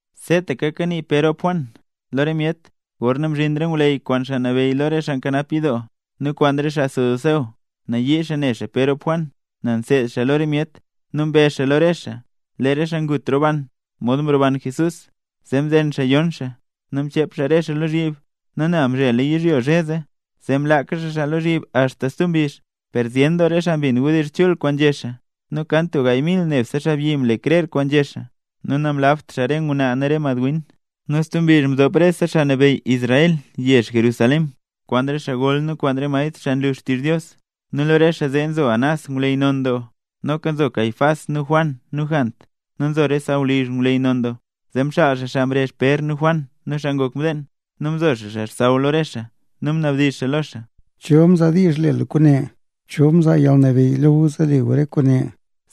Seetaka kanii Pér rop Juan lo re myet, gorna mzhin re ngwleyy, kwaan xaa nabeyy lo re xaa nkanap yidoo, nu kwaan re xaa saduceo. Nayii xaa ne xaa Pér rop Juan nel nseed xaa lo re myet. Nu mbezh xaa lo re xaa, lee re xaa ngut roban, mod mroban Jesús. Zee mzen xaa yon xaa, nu mchep re xaa xaa lozhyib. Nu nel mzhela yizhyo zhe zee, zee mlaaka xaa xaa lozhyib axta stub mbizh. Per zyen doo re xaa mbin wdizh chul kwaan nzhé xaa, nu kan tub gaay mil nebse xaabyi mle krer kwaan nzhé xaa, nu namlabt xaa re ngwnaa nu re madwin. Nu stub mbizh mdop rese xaa nabeyy Israel yezh Jerusalén, kwaan re xaa gol nu kwaan re maestr, xaa nlu xtizh Dios. Nu lo re xaa zee nzo Anás, ngwleyy non doo, noka nzo Caifás nu Juan nu Jant, nu nzo re sawlizh ngwleyy non doo. Zee mxaal xaa xaa mrezh Pér nu Juan nu xaa ngok mdeen, nu mzo xaa xaa xsaww lo re xaa, nu mnabdizh xaa lo xaa: —¿Cho mzaa diizh le gu kwaane? ¿Cho mzaa yalnabeyy lo gu zee nle gu rese kwaane?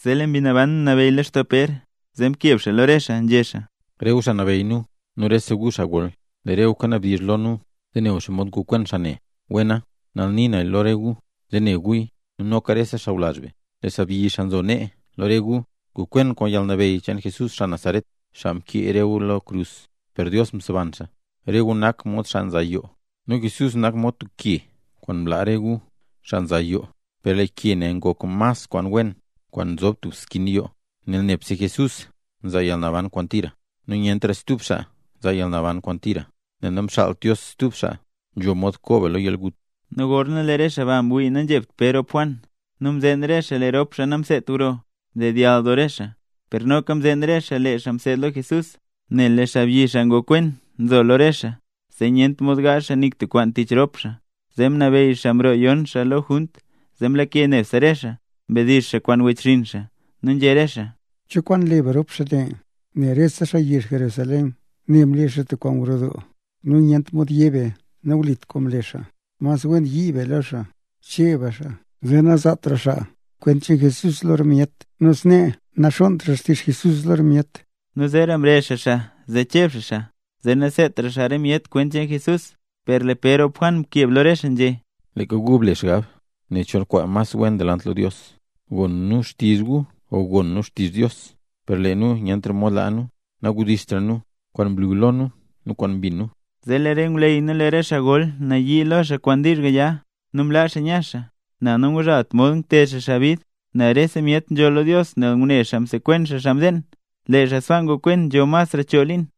Zee lee Mbi Naban mnabeyy lextoo Pér, zee mkeb xaa lo re xaa, nzhé xaa: —Rese gu xaa nabeyy nu, nu rese gu xaa gol, zee ne gu xomod ngokwen xaa ne. Wena, nal nii nu lo re gu zee ne guya nu noka rese sawlazh be, lee xaabyi xaa nzo nee lo re gu, ngokwen kwaan yalnabeyy cheen Jesús xaa Nazaret, xaa mkee re gu lo krus per Dios mseban xaa. Rese gu nak mod xaa nza yoo nu Jesús nak mod tub ke kwaan mlaa re gu, xaa nza yoo, per lee ke ne ngok ke mas kwaan wen kwaan nzob tub skin yoo. Nel nebse Jesús nzaa yalnaban kwaan tira, nu nyentra stub xaa nzaa yalnaban kwaan tira, nel namxaalt Dios stub xaa nzho mod koo be lo yalgut. Nu gorna lee re xaa ba mwii nanzhebt Pér rop Juan nu mzeen re xaa lee rop xaa namseedt gro, mdedyall doo re xaa. Per noka mzeen re xaa lee xaa mseed lo Jesús. Nel lee xaabyi xaa ngokwen nzo lo re xaa, zee nyent mod gaazh xaa nik tub kwaan tich rop xaa. Zee mnabeyy xaa mroo yon xaa lo junt, zee mlake nebse re xaa, mdizh xaa kwaan wechxinn xaa. Nu nzhé re xaa: —¿Cho kwaan le be kwaan rop xaa ne? Nel rese xaa yezh Jerusalén ne mle xaa tub kwaan gro doo nu nyent mod yé be nawlit kwaan mle xaa. Mas wen yii be lo xaa, cheb be xaa, zee nazaatra xaa kwent cheen Jesús lo re myet, nu snee naxonntra xtizh Jesús lo re myet. Nu zeera mrezh xaa xaa zee cheb xaa xaa, zee naseedtra xaa re myet kwent cheen Jesús. Per lee Pér rop Juan mkeb lo re xaa nzhé: —Leeka gu ble xgab nen cho mas wen delant lo Dios, gon nu xtizh gu o gon nu xtizh Dios. Per lee nu nyent mod laa nu nawdizhtra nu kwaan mlu lo nu nu kwaan mbin nu. Zee lee re ngwleyy nu re xaa gol nayii lo xaa kwaan wdizh gaya nu mlaa xaa nya xaa, nel nangzhaalt mod ngted xaa xaa bid, nel rese myet nzholl lo Dios nel ngune xaa msekwen xaa mdeen. Lee xaa sbaa ngokwen nzho masra choo liin.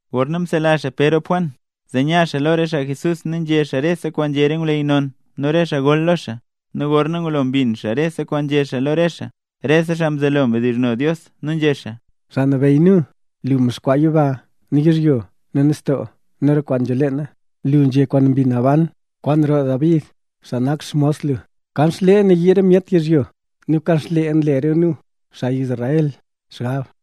Gorna msela xaa Pér rop Juan, zee nya xaa lo re xaa Jesús nu nzhé xaa rese kwaan nzhé re ngwleyy non nu re xaa gol lo xaa. Nu gorna ngulo mbin xaa rese kwaan nzhé xaa lo re xaa, rese xaa mzelo xaa mdizhno Dios, nu nzhé xaa: —Xaa Nabeyy nu. Lu mdexkwaa yiba nu yizhyo nu nistoo nu re kwaan nzho leena. Lu nzhé kwaan Mbi Naban kwaan roo David, xaa nak xmos lu: Kanxlee nayii re myet yizhyo, nu kanxlee nle re nu, xaa Israel, xgab.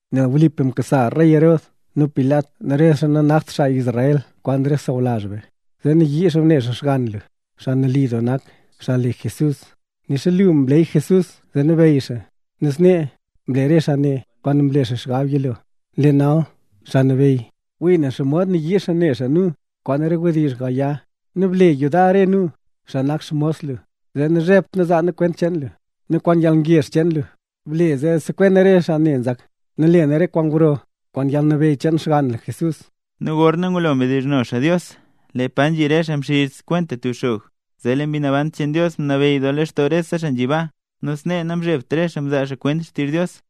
’Nel wlipa mkasa rey Herod nu Pilat nu re xaa nanakt xaa Israel kwaan re xaa sawlazh be, zee mnayii xaa ne xaa xgann lu, xaa nali doo nak, xaa le Jesús; nixa lu mleyy Jesús zee nabeyy xaa. Nu snee, mle re xaa ne kwaan mlela lu xgab yilo. Nu lee nal, Xaa Nabeyy, wii ne xomod nayii xaa ne xaa nu kwaan re wdizh gaya; nu ble yudar re nu, xaa nak xmos lu, zee nazhebt nu zaa nu xkwent lu. Nu kwaan yalngezh cheen lu ble zee sekwen nu re xaa ne nzak, nu le nu re kwaan gro kwaan yalnabeyy cheen xgann lu, Jesús. Gorna ngulo mdizhno xaa Dios, lee pa nzhi re xaa mxiz kwenta tub xog, zee lee Mbi Naban cheen Dios mnabeyy doo lextoo rese xaa nzhi baa, nu snee namzhebt re xaa nzaa kwent xtizh Dios.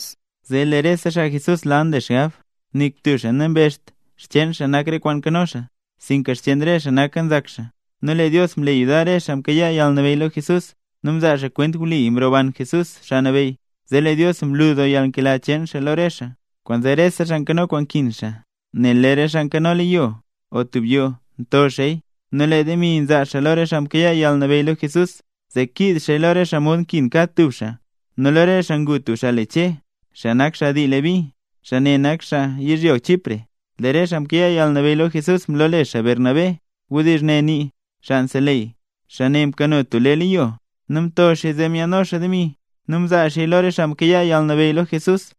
Zee lee rese xaa Jesús lal nle xaa xgab. Nik tub xaa nambezht xcheen xaa nak re kwaan nkano xaa, sinka xcheen re xaa naka, nzak xaa. Nu lee Dios mle yudar re xaa mkayaa yalnabeyy lo Jesús, nu mzaa xaa kwent wli mroban Jesús, Xaa Nabeyy. Zee lee Dios mlu doo yalnkela cheen lo re xaa xaa. Kwaanzee rese xaa nkano kwaan nkin, nel lee re xaa nkano leyo o tub yoo nto xaaya, nzaa xaa lo re xaa mkayaa yalnabeyy lo Jesús, zee kiiz xaaya lo re xaa mod nkin kad tub xaaya. Nu lo re xaa ngu tub xaa le Che, xaa nak dii Leví. Xaa ne nak xaa yizhyo Chipre. Lee re xaa mkayaa yalnabeyy lo Jesús mlole xaa Bernabé. (Wdizh ne nii: “Xaa Nseleyy”.) Xaa ne mkano tub lee leyo, nu mto xaaya zee myaadno xaa demi, nu mzaa xaaya lo re xaa mkayaa yalnabeyy lo Jesús.